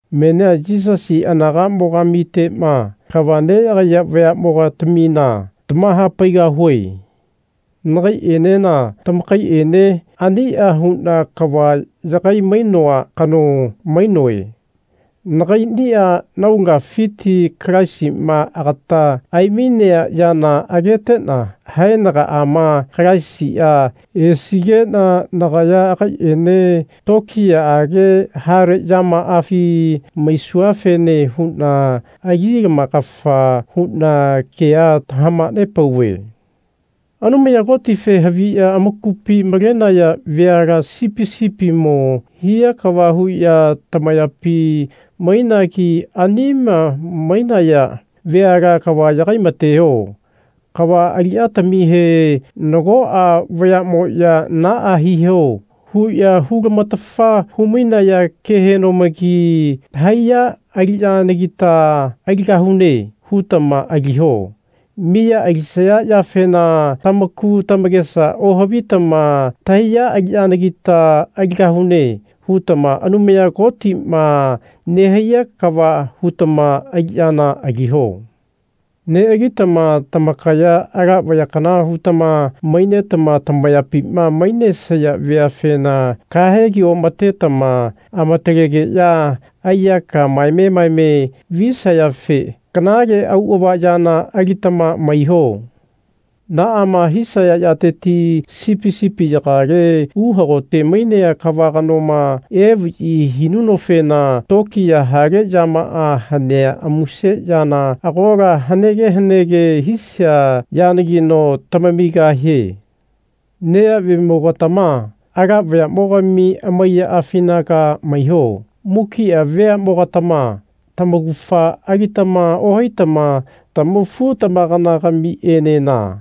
Menia Yisasi anagamo-gamitema kava neyagaiya vayamo-gatamina tamahapaigahue. Nagaienena tamakaiene ania huna kava yagai-mainoa kano mainoe. Nagainia naulagafiti Kalaisima agata aimainea yana agetena haenagaama Kalaisia esigena nagaya agaiene tokiyaage hale yamafi maisuafene huna ali-lamakafa huna kea tamahanepauve. Anumaya Kotife haviya amakupi malenaya veala sipi sipimo hia kava huya tamayapi mainagi anima mainaya veala kava yagai-mateho. Kava aliyatamihe nagoa vayamoya Naa hiho. huya hu-lamatafa hu-mainaya kehenomagi Tahaiya aliyanagita aligahune. hutama aliho. Miya alisaya yafena tamaku tamakesa ohavitama Tahaiya aliyanagita aligahune. hutama Anumaya Kotima nehaiya kava hutama aliyana aliho. Nealitama tamakaya ala vaya kana hutama mainetama tamayapima mainesaya veafena kahegi omatetama amatalegeya aiyaka maeme maeme visayafe kanale auava yana alitama maiho. Naama hisaya yateti sipi sipiyagale uhagote mainea kava kanoma evayi hinunofena tokiya hale yamaa hanea amuse yana agola hanege hanege hisia yanagino tamamigahie. Neyavemo-gatama ala vayamogami amaiyaafinaga maiho. Mukia veamogatama tamaugafa alitama ohaitama tamafu-tamakana-gamienena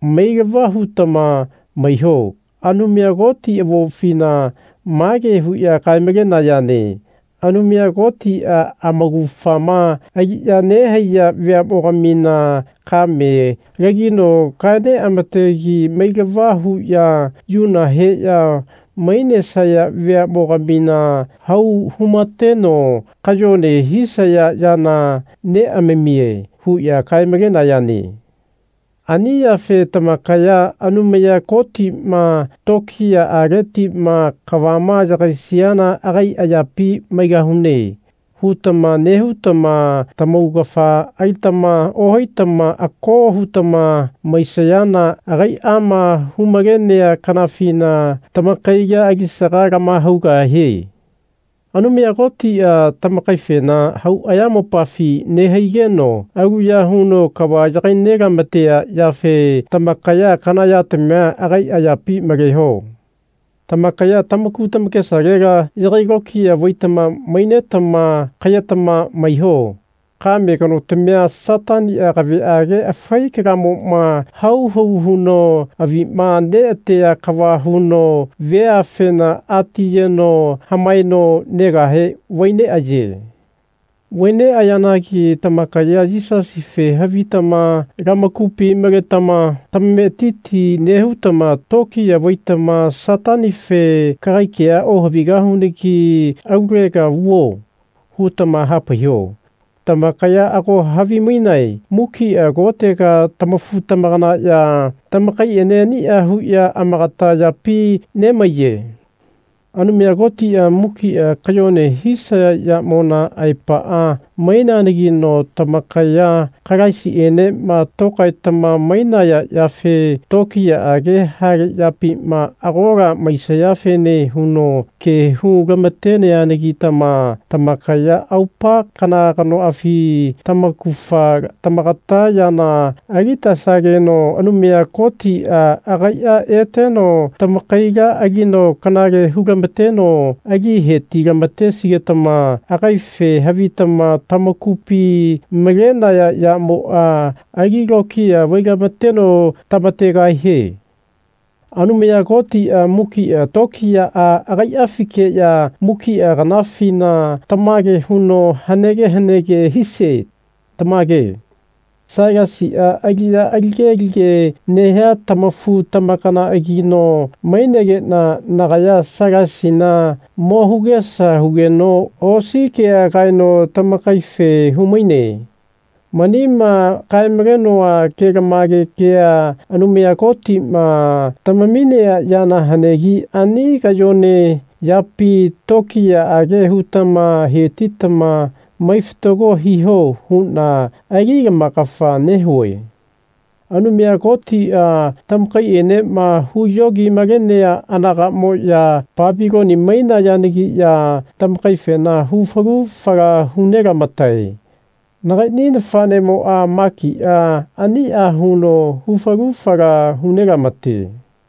mailava hutama maiho. Anumaya Koti avopfina mage huya kae-malenayane Anumaya Kotia amaugafama aliya nehaiya veamogamina kame lagino kae neamategi mailava huya yuna heya mainesaya veamo-gamina hau humateno kayone hisaya yana neamamie. huya kae-malenayane. Ani yafe tamakaya Anumaya Kotima tokiyaaletima kavama yagaisiana agai ayapi maigahune. hutama nehutama tamaugafa alitama ohaitama ako hutama maisayana agaiama hu-malenea kanafina tamakaila alisaga lamahaugahie. Anumaya Kotia tamakaifena hau ayamopafi nehaigeno aluya huno kava yagai nelamatea yafe tamakaya kana yatamia agai ayapi maleho. Tamakaya tamaku tamakesalela yagai lokiya vaitama mainetama kayetama maiho. Kame kanotamia Satania kaveage afai kalamoma hau hau huno avima neatea kava huno veafena ati yeno hamaeno negahe vai neaye. Vai neayeanagi tamakaya Yisasife havitama lamakupi maletama tamametiti nehutama tokiya vaitama Satanife Kagai kea ohavigahunagi alulega vuo. hutama hapaiho. Tamakaya ago havimainae mukia kotega tamafu-tamakanaya tamakaiene ania huya amakata yapi nemaiye. Anumaya Kotia mukia kayone hisaya yamona aepaa maineanagino tamakaya Kalaisienema tokaetama mainaya yafe tokiyaage hale yapima agola maisayafene huno ke hu lamateneanagitama tamakaya aupa kana kanoafi tamaugafa tamakata yana alitesageno Anumaya Kotia agaia eteno tamakaila alino kanale hu-lamateno ali heti-lamatesigetama agaife havitama tamakupi malenaya yamoa ali lokiya vai-lamateno tamategahie. Anumaya Kotia mukia tokiyaa agaiafikeya mukia kanafina tamage huno hanege hanege hisie. Tamage. Sailasia aliya alige alige nehia tamafu-tamakanaagino mainegena nagaya Sailasina mo hugesa hugeno osi kea kaeno tamakaife humaine. Manima kae-malenoa kelamage kea Anumaya Kotima tamaminea yana hanegi ani kayone yapi tokiyaage hutama hetitama mai fatago hiho huna ali lamakafa nehue. Anumaya Kotia tamakaienema huyogi-malenea anagamoya Papiloni mainayanagiya tamakaifena hu falu fala hu nelamatae. Nagaini nafanemoa, Makia, ania huno hu falu fala hu nelamate.